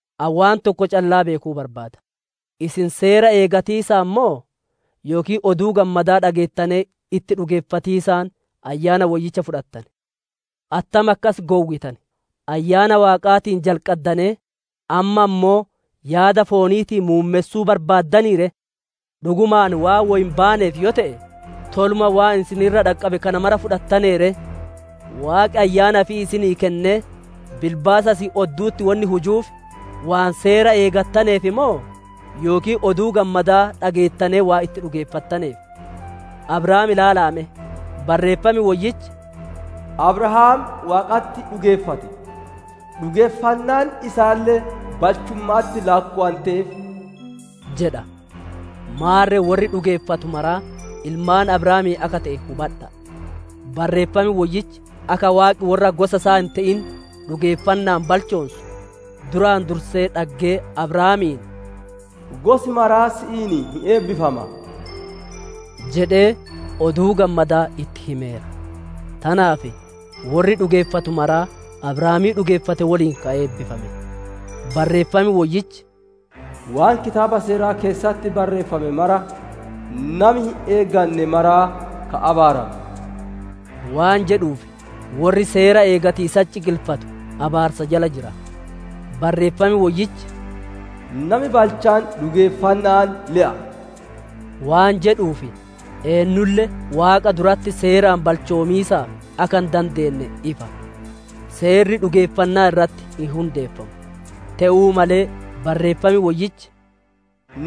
Ani waan tokko callaa beekuu barbaada: isin Seera eeggatiisaan moo, yookiin Oduu Gammadaa dhageettanee itti dhugeeffatiisaan Ayyaana Woyyicha fudhattane? Attam akkas gowwitan? Ayyaana Waaqaatiin jalqaddanee, amma ammoo yaada fooniitiin muummessuu barbaaddanii ree? Dhugumaan waan woy hin baaneef yoo te'e, toluma waan isin irra dhaqqabe kana mara fudhattanee ree? Waaqi Ayyaana ifii isinii kennee, bilbaasa isin oddu'utti wonni hujuuf, waan Seera eeggattaneef moo, yookiin Oduu Gammadaa dhageettanee waan itti dhugeeffattaneef? Abrahaam ilaala'a me; Barreeffami Woyyichi, «Abrahaam Waaqatti dhugeeffate; dhugeeffannaan isaalle balchumma'atti laakkowanteef» jedha. Maarre worri dhugeeffatu maraa ilmaan Abrahaamii akka te'e hubadha'a! Barreeffam Woyyichi akka Waaqi worra gosa isaa hin te'in dhugeeffanna'aan balchoonsu, duraan dursee dhaggee Abrahaamiin, «Gosi maraa si'iin hin eebbifama» jedhee, Oduu Gammadaa itti himeera. Tanaaf worri dhugeeffatu maraa, Abrahaamii dhugeeffate woliin ka eebbifame. Barreeffam Woyyichi, «Waan Kitaaba Seeraa keessatti barreeffame mara, nami hin eeganne maraa ka abaarame!» waan jedhuuf, worri Seera eeggatiisatti ciqilfatu abaarsa jala jira. Barreeffam Woyyichi, «Nami balchaan dhugeeffanna'aan le'a» waan jedhuuf, eennulle Waaqa duratti Seeraan balchoomiisaaf akka hin dandeenne ifa. Seerri dhugeeffannaa irratti hin hundeeffamu; te'uu malee Barreeffam Woyyichi,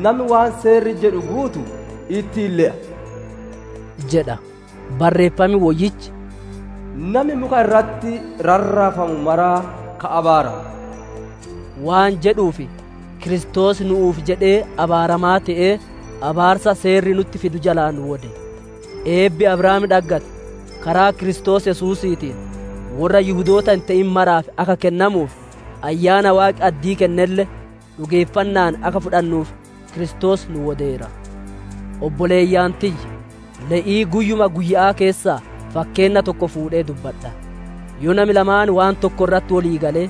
«Nami waan Seerri jedhu guutu, ittiin hin le'a» jedha. Barreeffam Woyyichi, «Nami muka irratti rarraafamu maraa ka abaarame» waan jedhuuf, Kiristoos nu'uuf jedhee abaaramaa te'ee, abaarsa Seerri nutti fidu jalaa nu wode. Eebbi Abrahaam dhaggate, karaa Kiristoos Yesuusiitiin, worra Yihudoota hin te'in maraaf akka kennamuuf, Ayyaana Waaqi addii kennelle, dhugeeffanna'aan akka fudhannuuf Kiristoos nu wodeera. Obboleeyyan tiyya, le'ii guyyuma guyya'aa keessaa fakkeenna tokko fuudhee dubbadha: yoo nami lamaan waan tokko irratti wolii galee,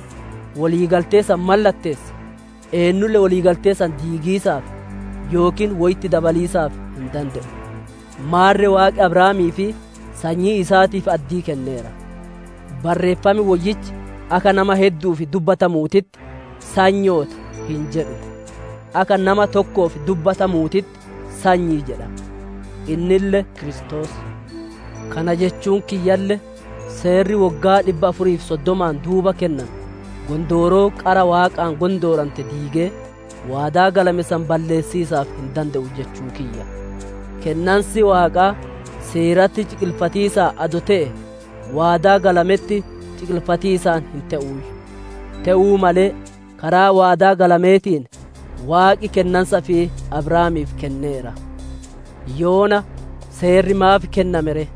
wolii galtee san mallatteesse, eennulle wolii galtee san diigiisaaf, yookiin woy itti dabaliisaaf hin dande'u. Maarre Waaqi Abrahaamii fi sanyii isaatiif addii kenneera; Barreeffam Woyyichi, akka nama heddu'uuf dubbatamuutitti, «Sanyoota» hin jedhu, akka nama tokkoof dubbatamuutitti, «Sanyii» jedha, innille Kiristoos. Kana jechuun kiyyalle, Seerri woggaa dhibba afurii fi soddomaan duuba kenname, gondooroo qara Waaqaan gondoorante diigee, waadaa galame san balleessiisaaf hin dande'u jechuu kiyya. Kennansi Waaqaa Seeratti ciqilfatiisaan adoo te'ee, waadaa galametti ciqilfatiisaan hin te'uuyyu. Te'uu malee, karaa waadaa galameetiin, Waaqi kennansa ifii Abrahaamiif kenneera. Yoona Seerri maaf kenname ree?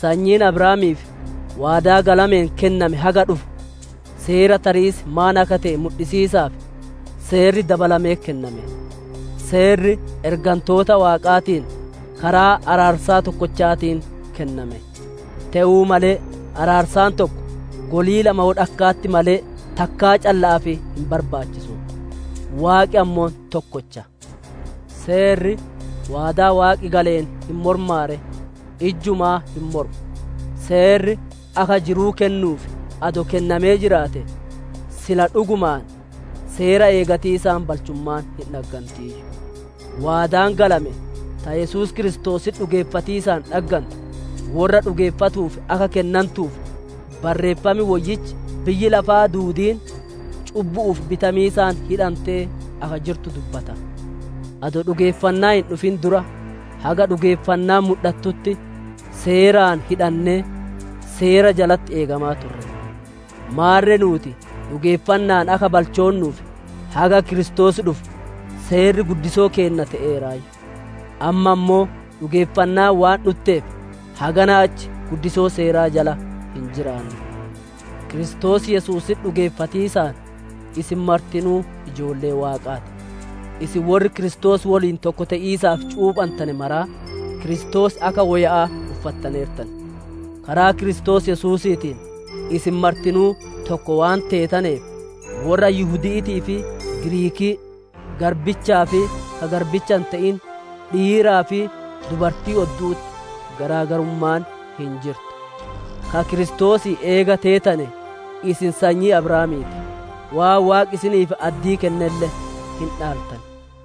Sanyiin Abrahaamiif waadaa galameen kenname haga dhufu, seera tariis maan akka te'e mudhisiisaaf, Seerri dabalamee kenname. Seerri ergantoota Waaqaatiin, karaa araarsaa tokkochaatiin kenname. Te'uu malee, araarsaan tokko golii lama wolakka'atti malee takkaa calla'aaf hin barbaachisu; Waaqi ammoo tokkocha. Seerri waadaa Waaqi galeen hin mormaa ree? Ijjumaa hin mormu! Seerri akka jiruu kennuuf adoo kennamee jiraate, sila dhugumaan, Seera eeggatiisaan balchummaan hin dhaggantiiyyu. Waadaan galame, ta Yesuus Kiristoositti dhugeeffatiisaan dhaggantu, worra dhugeeffatuuf akka kennantuuf, Barreeffam Woyyichi biyyi lafaa duudiin cubbu'uuf bitamiisaan hidhantee akka jirtu dubbata. Adoo dhugeeffannaan hin dhufin dura, haga dhugeeffannaan mudhatutti, Seeraan hidhannee, Seera jalatti eegamaa ture. Maarre nuuti dhugeeffanna'aan akka balchoonnuuf, haga Kiristoos dhufu, Seerri guddisoo keenna te'eeraayyu. Amma ammoo, dhugeeffannaan waan dhutteef, haganaa achi guddisoo Seeraa jala hin jiraannu. Kiristoos Yesuusitti dhugeeffatiisaan, isin martinuu ijoollee Waaqaa ti. Isin worri Kiristoos woliin tokko te'iisaaf cuuphantane maraa, Kiristoos akka woya'aa uffattaneertan. Karaa Kiristoos Yesuusiitiin, isin martinuu tokko waan teetaneef, worra Yihudi'iitii fi Giriikii, garbichaa fi ka garbicha hin te'in, dhiiraa fi dubartii oddu'utti garaagarummaan hin jirtu. Ka Kiristoosii eega teetane, isin sanyii Abrahaamii ti; waan Waaqi isiniif addii kennelle hin dhaaltan.